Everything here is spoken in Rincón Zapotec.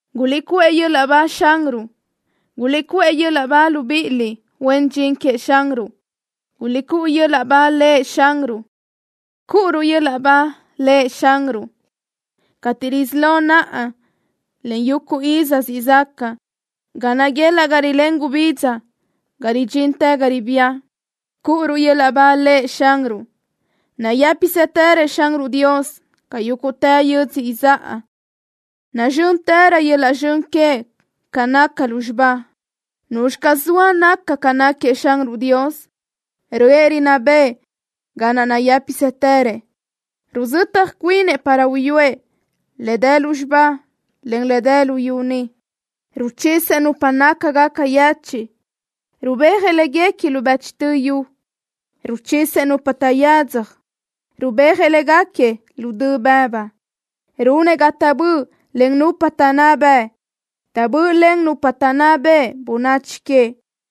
¡Guliʼcuʼë yöl-laʼ ba Xanruʼ! ¡Guliʼcuʼë yöl-laʼ ba, libíʼiliʼ huen dxin queëʼ Xanruʼ! ¡Guliʼcúʼu yöl-laʼ ba Lëʼ Xanruʼ! ¡Cúʼuruʼ yöl-laʼ ba Lëʼ Xanruʼ, cateʼ risí lo naʼa, en yuguʼ iz siʼ zaca! ¡Ga naguelaʼ ga rilén gubidza ga ridxintë ga ribía, cúʼuruʼ yöl-laʼ ba Lëʼ Xanruʼ! ¡Nayë́pisëtërëʼ Xanruʼ Dios ca yúguʼtë yödzö izáʼa! ¡Nazxö́ntërö yöl-laʼ zxön queëʼ ca naca lúzxiba! ¿Nuzxi caz zoa naca ca náquiëʼ Xanruʼ Dios? Röʼë rinná bëʼë ga naʼ nayë́pisëtërëʼ. Ruzötaj cuinëʼ para uyúëʼ le dë lúzxiba, en le dë luyú ni. Ruchisëʼ nupa nácagaca yechiʼ, rubéajëʼ léguequi lu bëchtö yu. Ruchisëʼ nupa taʼyadzaj, rubéajëʼ léguequi lu dö bëbu. Runëʼ ga taʼböʼlen nupa taʼnná bëʼ. Taʼböʼlen nupa taʼnná beʼe bönachi queëʼ.